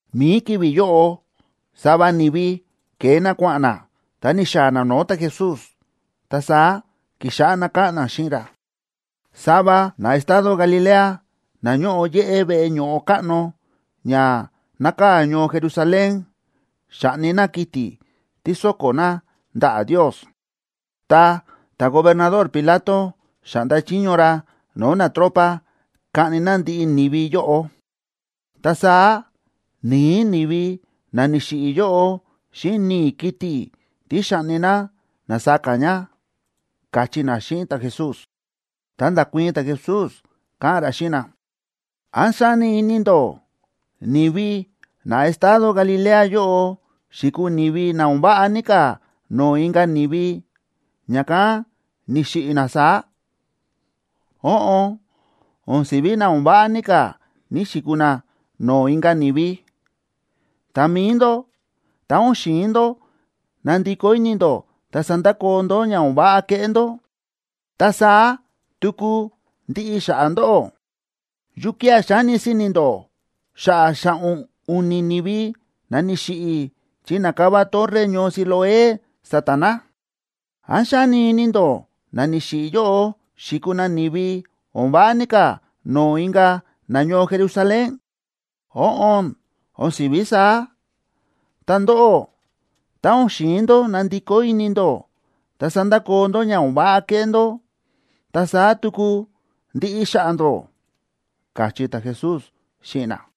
Mi̱i ki̱vi̱ yóꞌo, sava ni̱vi ke̱e na kua̱ꞌa̱n na, ta ni̱xaa̱ na no̱o̱ ta̱Jesús. Ta saá ki̱xáꞌá na káꞌa̱n na xíꞌin ra: ―Sava na estado Galilea na ñóꞌo yéꞌé veꞌe ño̱ꞌo káꞌno ña nákaa̱ ñoo Jerusalén, xa̱ꞌni na kiti̱ tí so̱ko̱ na ndaꞌa̱ Ndios. Ta ta̱gobernador Pilato xa̱ꞌnda chiño ra no̱o̱ natropa kaꞌni na ndiꞌi ni̱vi yóꞌo. Ta saá ni̱i̱ ni̱vi na ni̱xiꞌi̱ yóꞌo xíꞌin ni̱i̱ kiti̱ tí xa̱ꞌni na na̱saka ña ―káchí na xíꞌin ta̱Jesús. Ta nda̱kuii̱n ta̱Jesús, káꞌa̱n ra xíꞌin na: ―¿Án xáni ini ndó ni̱vi na estado Galilea yóꞌo xi̱kuu ni̱vi na o̱n váꞌa ní ka̱ no̱o̱ inka̱ ni̱vi, ña̱kán ni̱xiꞌi̱ na saá? Óꞌon, o̱n si̱ví na o̱n váꞌa ní ka̱ ni̱‑xikuu na no̱o̱ inka̱ ni̱vi. Ta mi̱i ndó, tá o̱n xi̱in ndó nandikó ini ndó ta sandakoo ndó ña o̱n váꞌa kéꞌé ndó, ta saá tuku ndiꞌi xa̱ꞌa̱ ndóꞌó. ¿Yukía̱ xáni si̱ni̱ ndó xa̱ꞌa̱ xa̱ꞌo̱n u̱ni̱ ni̱vi na ni̱xiꞌi̱ chi na̱kava torre ñoo Siloé sa̱ta̱ na? ¿Án xáni ini ndó na ni̱xiꞌi̱ yóꞌo xi̱kuu na ni̱vi o̱n váꞌa ní ka̱ no̱o̱ inka̱ nañoo Jerusalén? Óꞌon, o̱n si̱ví saá. Ta ndóꞌó, tá o̱n xi̱in ndó nandikó ini ndó, ta sandakoo ndó ña o̱n váꞌa kéꞌé ndó, ta saá tuku ndiꞌi xa̱ꞌa̱ ndóꞌó ―káchí ta̱Jesús xíꞌin na.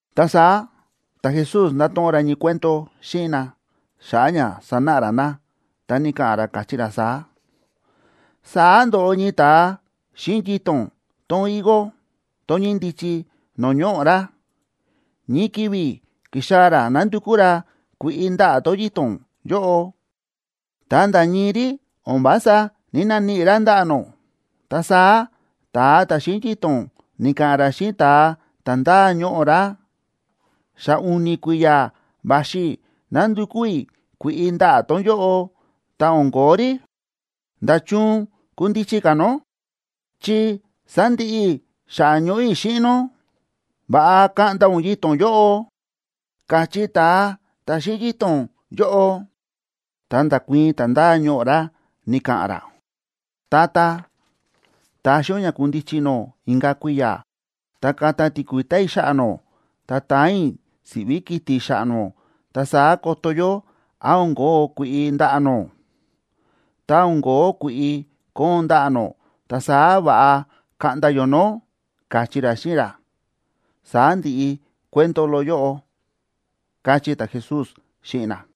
Ta saá ta̱Jesús nda̱to̱ꞌon ra ñii cuento xíꞌin na xa̱ꞌa̱ ña sanáꞌa ra na, ta ni̱ka̱ꞌa̱n ra, káchí ra saá: ―Saá ndo̱ꞌo ñii ta̱a xíꞌin yito̱n tón higo, tón ñíndichi no̱o̱ ñoꞌo̱ ra. Ñii ki̱vi̱ ki̱xaa̱ ra nándukú ra kui̱ꞌi ndaꞌa̱ tón yito̱n yóꞌo, ta nda̱ ñii rí, o̱n vása ní‑naníꞌi ra ndaꞌa̱ nó. Ta saá ta̱a ta̱ xíꞌin yito̱n ni̱ka̱ꞌa̱n ra xíꞌin ta̱a ta̱ ndáa ñoꞌo̱ ra: “Xa u̱ni̱ kui̱ya̱ va̱xi i̱ nándukú i̱ kui̱ꞌi ndaꞌa̱ tón yóꞌo, ta o̱n ko̱ó rí. ¿Nda̱chun kundichi ka̱ nó?, chi sándiꞌi i̱ xa̱ꞌa̱ ñoꞌo̱ i̱ xíꞌin nó. Va̱ꞌa kaꞌnda ún yito̱n yóꞌo”, káchí ta̱a ta̱ xíꞌin yito̱n yóꞌo. Ta nda̱kuii̱n ta̱ ndáa ñoꞌo̱ ra, ni̱ka̱ꞌa̱n ra: “Tata, taxi ún ña kundichi nó inka̱ kui̱ya̱, ta kata tíkui̱ta̱ i̱ xa̱ꞌa̱ nó, ta taan i̱ siꞌví kiti̱ xa̱ꞌa̱ nó, ta saá koto yó án o̱n kóo kui̱ꞌi ndaꞌa̱ nó. Tá o̱n kóo kui̱ꞌi koon ndaꞌa̱ nó, ta saá va̱ꞌa kaꞌnda yó nó”, káchí ra xíꞌin ra. Saá ndi̱ꞌi cuento loꞌo yóꞌo ―káchí ta̱Jesús xíꞌin na.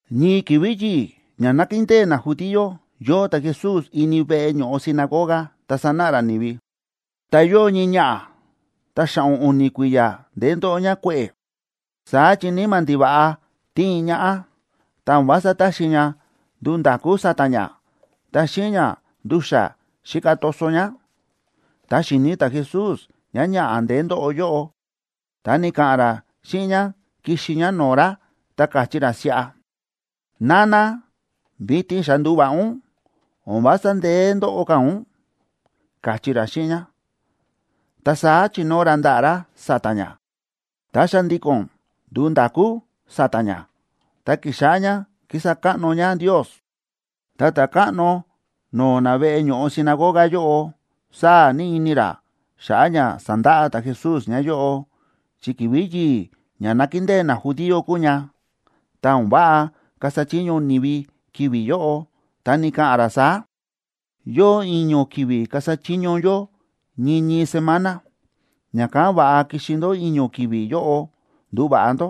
Ñii ki̱vi̱ yi̱i̱ ña nákindée najudío, yóo ta̱Jesús ini veꞌe ño̱ꞌo sinagoga ta sánáꞌa ra ni̱vi. Ta yóo ñii ñaꞌa̱, ta xa̱ꞌo̱n u̱ni̱ kui̱ya̱ ndeé ndóꞌo ñá kue̱ꞌe̱. Saá chi níma̱ ndiva̱ꞌa tíin ñaꞌá, ta o̱n vása táxi ña nduu nda̱kú sa̱ta̱ ñá, ta xíꞌin ña ndu̱xa̱ xíka toso ñá. Tá xi̱ni̱ ta̱Jesús ñáñaꞌa̱ ndeé ndóꞌo yóꞌo, ta ni̱ka̱ꞌa̱n ra xíꞌin ñá kixi ñá no̱o̱ ra, ta káchí ra siꞌa: ―Nana, vitin xa ndúva̱ꞌa ún, o̱n vása ndeé ndóꞌo ka̱ ún ―káchí ra xíꞌin ñá. Ta saá chi̱nóo ra ndaꞌa̱ ra sa̱ta̱ ñá, ta xa̱ndi̱ko̱n ndu̱u nda̱kú sa̱ta̱ ñá, ta ki̱xáꞌá ñá kísa káꞌno ñá Ndios. Ta ta̱káꞌno no̱o̱ na veꞌe ño̱ꞌo sinagoga yóꞌo, sáa̱ ní ini ra xa̱ꞌa̱ ña sa̱ndaꞌa ta̱Jesús ñáyóꞌo, chi ki̱vi̱ yi̱i̱ ña nákindée najudío kúu ña, ta o̱n váꞌa kasa chiño ni̱vi ki̱vi̱ yóꞌo. Ta ni̱ka̱ꞌa̱n ra saá: ―Yóo i̱ño̱ ki̱vi̱ kasa chiño yó ñii ñii semana. Ña̱kán va̱ꞌa kixi ndó i̱ño̱ ki̱vi̱ yóꞌo nduva̱ꞌa ndó,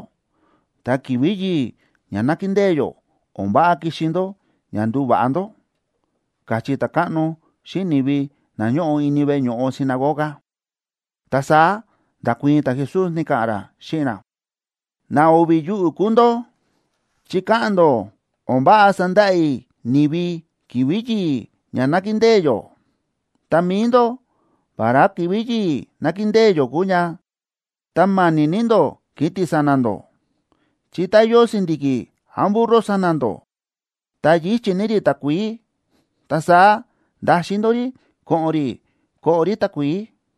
ta ki̱vi̱ yi̱i̱ ña nákindée yó o̱n váꞌa kixi ndó ña nduva̱ꞌa ndó ―káchí ta̱káꞌno xíꞌin ni̱vi na ñóꞌo ini veꞌe ño̱ꞌo sinagoga. Ta saá nda̱kuii̱n ta̱Jesús, ni̱ka̱ꞌa̱n ra xíꞌin na: ―¡Na o̱vi̱ yuꞌu̱ kúu ndó!, chi káꞌa̱n ndó o̱n váꞌa sandaꞌa i̱ ni̱vi ki̱vi̱ yi̱i̱ ña nákindée yó. Ta mi̱i ndó, vará ki̱vi̱ yi̱i̱ nákindée yó kúu ña, ta ma̱ni̱ ní ndó kiti̱ sa̱na̱ ndó. Chi tá yóo si̱ndi̱ki̱ án burro sa̱na̱ ndó ta yíchi̱ ní rí takuií, ta saá ndaxin ndó rí ko̱ꞌo̱n rí koꞌo rí takuií.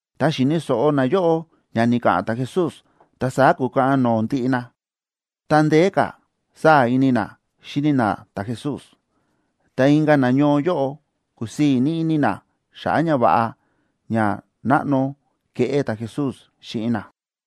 Tá xi̱ni̱ so̱ꞌo nayóꞌo ña ni̱ka̱ꞌa̱n ta̱Jesús, ta saá kúkaꞌan no̱o̱ ndiꞌi na, ta ndeé ka̱ sáa̱ ini na xíni na ta̱Jesús. Ta inka̱ nañoo yóꞌo, kúsii̱ ní ini na xa̱ꞌa̱ ñava̱ꞌa ña náꞌno ke̱ꞌé ta̱Jesús xíꞌin na.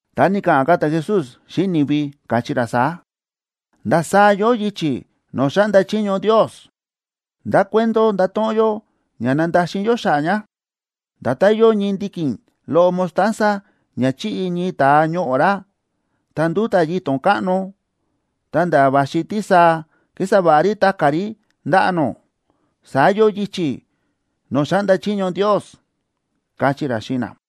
Ta ni̱ka̱ꞌa̱n ka̱ ta̱Jesús xíꞌin ni̱vi, káchí ra saá: ―¿Ndasaá yóo yichi̱ no̱o̱ xáꞌnda chiño Ndios? ¿Ndá cuento ndato̱ꞌon yó ña nandaxin yó xa̱ꞌa̱ ña? Nda̱tán yóo ñii ndiki̱n loꞌo mostaza, ña chi̱ꞌi ñii ta̱a ñoꞌo̱ ra, ta ndúta̱ yito̱n káꞌno, ta̱nda̱ va̱xi tísaa kísa va̱ꞌa rí ta̱ka̱ rí ndaꞌa̱ nó, saá yóo yichi̱ no̱o̱ xáꞌnda chiño Ndios ―káchí ra xíꞌin na.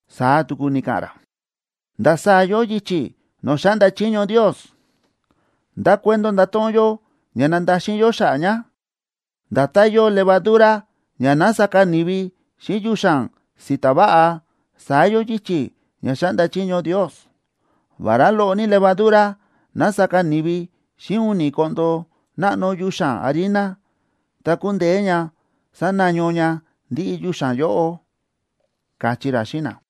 Saá tuku ni̱ka̱ꞌa̱n ra: ―¿Ndasaá yóo yichi̱ no̱o̱ xáꞌnda chiño Ndios? ¿Ndá cuento ndato̱ꞌon yó ña nandaxin yó xa̱ꞌa̱ ña? Nda̱tán yóo levadura ña na̱saka ni̱vi xíꞌin yuxa̱n si̱ta̱ váꞌa, saá yóo yichi̱ ña xáꞌnda chiño Ndios. Vará loꞌo ní levadura na̱saka ni̱vi xíꞌin u̱ni̱ koꞌndo náꞌno yuxa̱n harina, ta ku̱ndeé ña sanaño ña ndiꞌi yuxa̱n yóꞌo ―káchí ra xíꞌin na.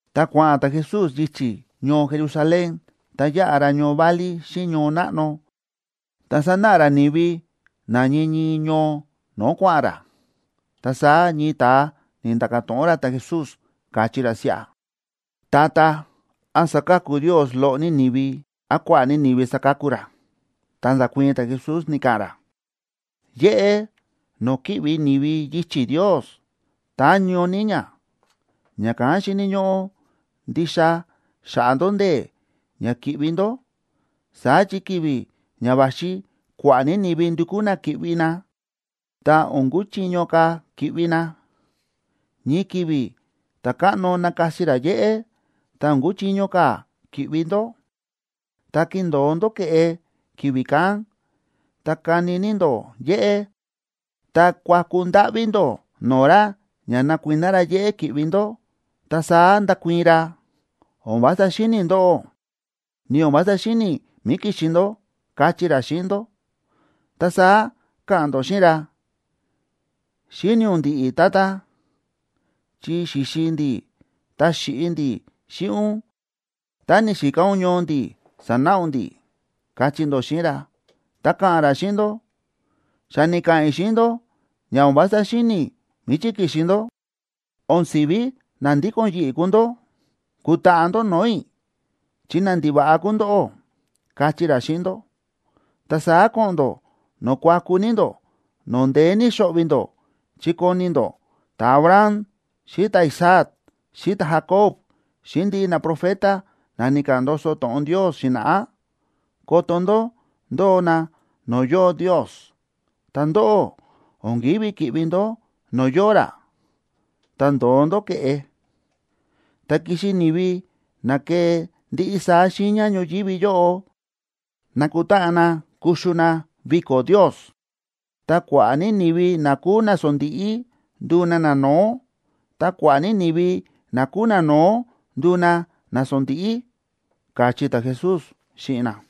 Ta kua̱ꞌa̱n ta̱Jesús yichi̱ ñoo Jerusalén, ta yáꞌa ra ñoo válí xíꞌin ñoo náꞌno, ta sánáꞌa ra ni̱vi na ñii ñii ñoo no̱o̱ kua̱ꞌa̱n ra. Ta saá ñii ta̱a ni̱nda̱ka̱ to̱ꞌon ra ta̱Jesús, káchí ra siꞌa: ―Tata, ¿án saka̱ku Ndios loꞌo ní ni̱vi, án kua̱ꞌa̱ ní ni̱vi saka̱ku ra? Ta nda̱kuii̱n ta̱Jesús, ni̱ka̱ꞌa̱n ra: ―Yéꞌé no̱o̱ ki̱ꞌvi ni̱vi yichi̱ Ndios táñó ní ña, ña̱kán xíni̱ ñóꞌó ndixa xaꞌa ndó ndee̱ ña ki̱ꞌvi ndó. Saá chi ki̱vi̱ ña va̱xi kua̱ꞌa̱ ní ni̱vi ndukú na ki̱ꞌvi na, ta o̱n kuchiño ka̱ ki̱ꞌvi na. Ñii ki̱vi̱ ta̱káꞌno nakasi ra yéꞌé, ta o̱n kuchiño ka̱ ki̱ꞌvi ndó. Tá kindo̱o ndó ke̱ꞌe ki̱vi̱ kán, ta kani ní ndó yéꞌé, ta kuaku ndáꞌví ndó no̱o̱ ra ña nakuiná ra yéꞌé ki̱ꞌvi ndó, ta saá ndakuii̱n ra: “O̱n vása xíni̱ i̱ ndóꞌó, ni o̱n vása xíni̱ i̱ mí ki̱xi ndó”, kachí ra xíꞌin ndó. Ta saá ka̱ꞌa̱n ndó xíꞌin ra: “Xíni̱ ún ndi̱ꞌi̱, tata, chi xi̱xi ndi̱, ta xi̱ꞌi ndi̱ xíꞌin ún, ta ni̱xika ún ñoo ndi̱ sa̱náꞌa ún ndi̱”, kachí ndó xíꞌin ra. Ta ka̱ꞌa̱n ra xíꞌin ndó: “Xa ni̱ka̱ꞌa̱n i̱ xíꞌin ndó ña o̱n vása xíni̱ i̱ míchí ki̱xi ndó. O̱n si̱ví na ndíko̱n yi̱ꞌi̱ kúu ndó, kutaꞌa ndó no̱o̱ i̱, chi nandiva̱ꞌa kúu ndóꞌó”, kachí ra xíꞌin ndó. Ta saá ko̱ꞌo̱n ndó no̱o̱ kuaku ní ndó, no̱o̱ ndeé ní xo̱ꞌvi̱ ndó, chi koni ndó ta̱Abraham xíꞌin ta̱Isaac, xíꞌin ta̱Jacob, xíꞌin ndiꞌi naprofeta na ni̱ka̱ꞌa̱n ndoso to̱ꞌon Ndios xi̱na̱ꞌá, koto ndó ndóo na no̱o̱ yóo Ndios. Ta ndóꞌó, o̱n kívi ki̱ꞌvi ndó no̱o̱ yóo ra, ta ndo̱o ndó ke̱ꞌe. Ta kixi ni̱vi na kee ndiꞌi saá xiiña ñoyívi yóꞌo nakutáꞌan na kuxu na viko̱ Ndios. Ta kua̱ꞌa̱ ní ni̱vi na kúu nasondíꞌí nduu na nano̱ó, ta kua̱ꞌa̱ ní ni̱vi na kúu nano̱ó nduu na nasondíꞌí ―káchí ta̱Jesús xíꞌin na.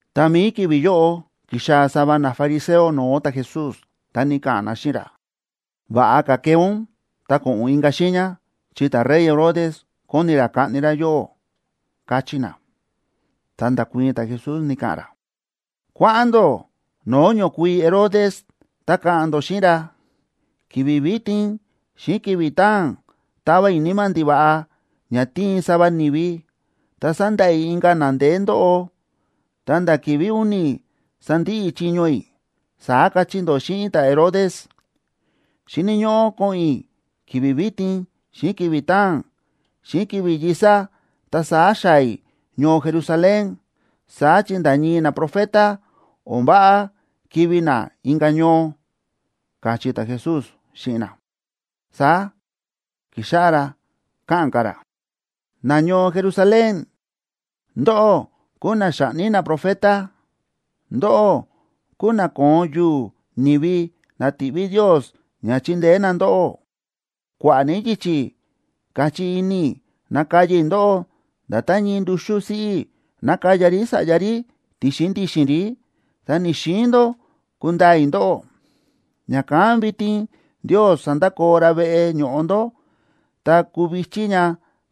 Ta mi̱i ki̱vi̱ yóꞌo, ki̱xaa̱ sava nafariseo no̱o̱ ta̱Jesús, ta ni̱ka̱ꞌa̱n na xíꞌin ra: ―Va̱ꞌa ka̱ kee ún ta ko̱ꞌo̱n ún inka̱ xiiña, chi ta̱rey Herodes kóni ra kaꞌni ra yóꞌó ―káchí na. Ta nda̱kuii̱n ta̱Jesús, ni̱ka̱ꞌa̱n ra: ―Kua̱ꞌa̱n ndó no̱o̱ ñokuii Herodes, ta ka̱ꞌa̱n ndó xíꞌin ra: “Ki̱vi̱ vitin xíꞌin ki̱vi̱ taa̱n tava i̱ níma̱ ndiva̱ꞌa ña tíin sava ni̱vi, ta sandaꞌa i̱ inka̱ na ndeé ndóꞌo, ta̱nda̱ ki̱vi̱ u̱ni̱ sandiꞌi i̱ chiño i̱”, saá kachí ndó xíꞌin ta̱Herodes. Xíni̱ ñóꞌó ko̱ꞌo̱n i̱ ki̱vi̱ vitin xíꞌin ki̱vi̱ taa̱n xíꞌin ki̱vi̱ yi̱sa, ta saá xaa̱ i̱ ñoo Jerusalén. Saá chi nda̱ ñii naprofeta, o̱n váꞌa kivi̱ na inka̱ ñoo ―káchí ta̱Jesús xíꞌin na. Saá ki̱xáꞌá ra káꞌa̱n ka̱ ra: ―¡Nañoo Jerusalén, ndóꞌó kúu na xáꞌni naprofeta, ndóꞌó kúu na kóon yu̱u̱ ni̱vi na ti̱ꞌví Ndios ña chindeé na ndóꞌó! ¡Kua̱ꞌa̱ ní yichi̱ káchí ini i̱ nakaya i̱ ndóꞌó, nda̱tán ñii nduxú siꞌí nákaya rí sa̱ꞌya rí ti̱xin ndi̱xi̱n rí, ta ni̱‑xiin ndó kundaa i̱ ndóꞌó! Ña̱kán vitin Ndios sandakoo ra veꞌe ño̱ꞌo ndó, ta kuu vi̱chí ña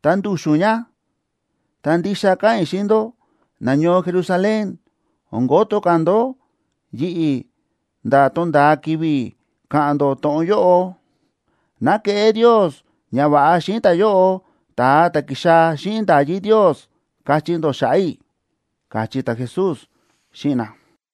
ta ndu̱xu̱n ña. Ta ndixa káꞌa̱n i̱ xíꞌin ndó, nañoo Jerusalén, o̱n koto ka̱ ndó yi̱ꞌi̱ nda̱ tonda̱a ki̱vi̱ ka̱ꞌa̱n ndó to̱ꞌon yóꞌo: “Ná keꞌé Ndios ñava̱ꞌa xíꞌin ta̱yóꞌo, ta̱a ta̱ ki̱xaa̱ xíꞌin nda̱yí Ndios”, kachí ndó xa̱ꞌa̱ i̱ ―káchí ta̱Jesús xíꞌin na.